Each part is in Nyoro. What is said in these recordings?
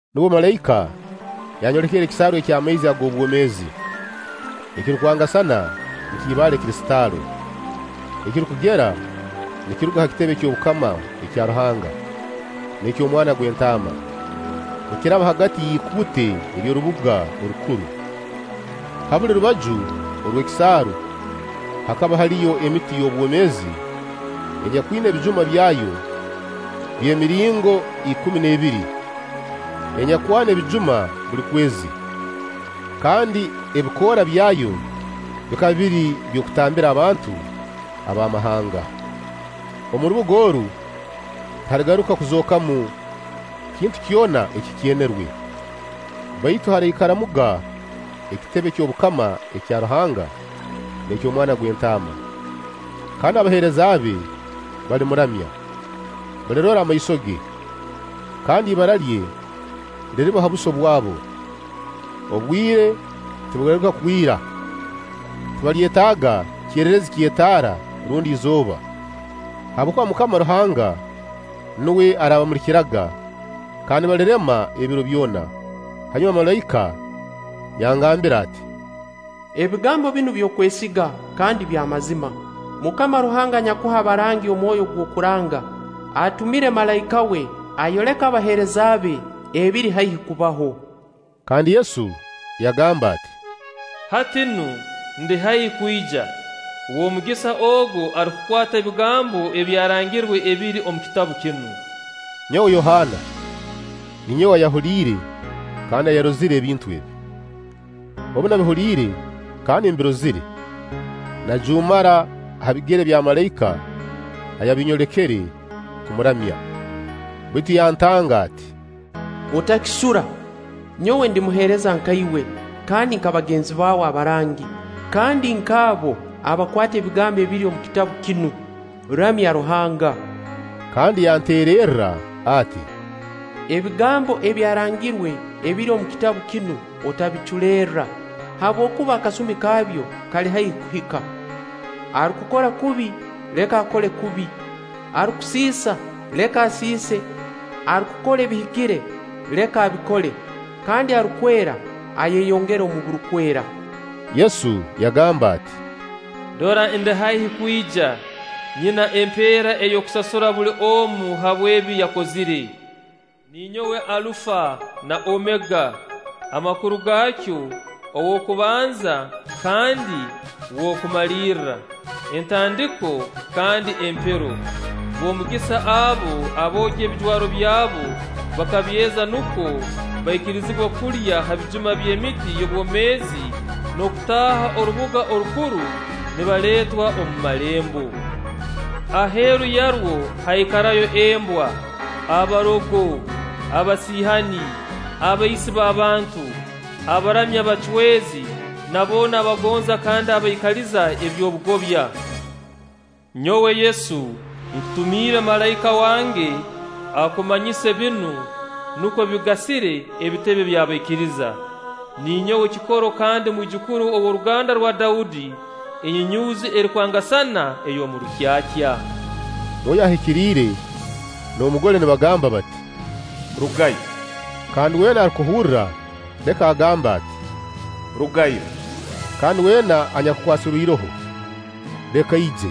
Nubwo malaika yanyolekere ekisaaru eky'amaizi ag'obwomeezi, ekirukwangasana nk'ibaale kristaalo, ekirukugera nikiruga ha kitebe ky'obukama ekya Ruhanga n'eky'Omwana gw'Entaama, nikiraba hagati y'ikuute ery'orubuga orukuru. Ha buli rubaju orw'ekisaaru hakaba haliyo emiti y'obwomeezi enyakwina ebijuma byayo by'emiringo ikumi n'ebiri, enyakwana ebijuma buli kwezi; kandi ebikoora byayo bikaba biri by'okutambira abantu ab'amahanga. Omu rubuga oru tihaligaruka kuzookamu kintu kyona ekikyenerwe, baitu haraikaramuga ekitebe ky'obukama ekya Ruhanga n'eky'Omwana gw'Entaama, kandi abaheereza be balimuramya. Balirora amaiso ge, kandi ibara lye liriba ha buso bwabo. Obwire tibuligaruka kwira; tibalyetaaga kererezi ky'etaara rundi izooba, habwokuba MUKAMA Ruhanga nuwe araabamulikiraga kandi balirema ebiro byona. Hanyuma malaika yangambira ati: “Ebigambo binu by'okwesiga kandi by'amazima. MUKAMA Ruhanga anyakuha abarangi omwoyo ogw'okuranga, atumire malaika we ayoleke abaheereza be ebiri haihi kubaho.” Kandi Yesu yagamba ati: “Hati nu, ndi haihi kwija. W'omugisa ogu arukukwata ebigambo ebyarangirwe ebiri omu kitabu kinu.” Nyowe Yohaana, ninyowe ayahuliire kandi ayarozire ebintu ebi. Obu nabihuliire kandi mbirozire, najuumara ha bigere bya malaika ayabinyolekere kumuramya; baitu yantanga ati: “Otakisura! Nyowe ndi muheereza nka iwe kandi nka bagenzi bawe abarangi, kandi nk'abo abakwata ebigambo ebiri omu kitabu kinu. Ramya Ruhanga!” Kandi yanteererra ati: “Ebigambo ebyarangirwe ebiri omu kitabu kinu otabiculerra, habwokuba akasumi kabyo kali haihi kuhika. Arukukora kubi, leka akole kubi, arukusiisa, leka asiise; arukukora ebihikire, leka abikole; kandi arukwera, ayeyongere omu burukwera.” Yesu yagamba ati: “Dora ndi haihi kwija. Nyina empeera ey'okusasura buli omu habw'ebi yakozire. Ninyowe Alufa na Omega, amakuru gaakyo: Ow'okubanza kandi Nw'okumalirra, Entandiko kandi Empero.” B'omugisa abo aboogya ebijwaro byabu bakabyeza, nukwo baikirizibwe kulya ha bijuma by'emiti y'obwomeezi n'okutaaha orubuga orukuru nibaleetwa omu malembo. Aheeru yarwo haikarayo embwa, abarogo, abasiihani, abaisi b'abantu, abaramya abacwezi na boona abagonza kandi abaikaliza eby'obugobya. “Nyowe Yesu, nkutumiire malaika wange akumanyise binu, nukwo bigasire ebitebe by'abaikiriza. Ninyowe kikoro kandi mwijukuru ow'oruganda rwa Daudi, enyunyuuzi erukwangasana ey'omu rukyakya.” Mwoyo Ahikiriire n'Omugole nibagamba bati: “Rugayo.” Kandi weena arukuhurra, leka agambe ati: “Rugayo.” Kandi wena anyakukwasirwe iroho, leka aije;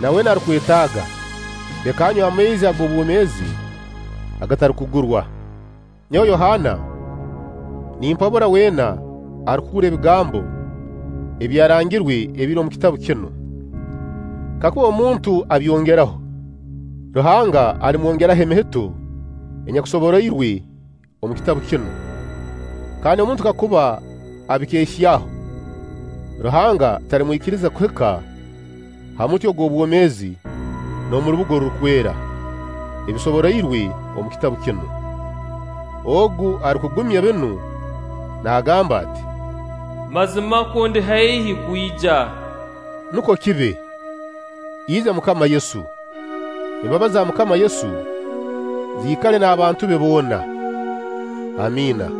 na weena arukwetaaga, leka anywe amaizi ag'obwomeezi agatarukugurwa. Nyowe Yohaana, nimpabura weena arukuhurra ebigambo ebyarangirwe ebiri omu kitabu kinu: Kakuba omuntu abyongeraho, Ruhanga alimwongeraho emihito enyakusoboroirwe omu kitabu kinu. Kandi omuntu kakuba abikeehyaho, Ruhanga talimwikiriza kuhika ha muti ogw' obwomeezi n'omu rubuga orurukwera, ebisoboroirwe omu kitabu kinu. Ogu arukugumya binu naagamba ati: “Mazimakwo ndi haihi kwija.” Nukwo kibe! Ija MUKAMA Yesu! Embabazi za MUKAMA Yesu ziikale n'abantu be boona. Amiina.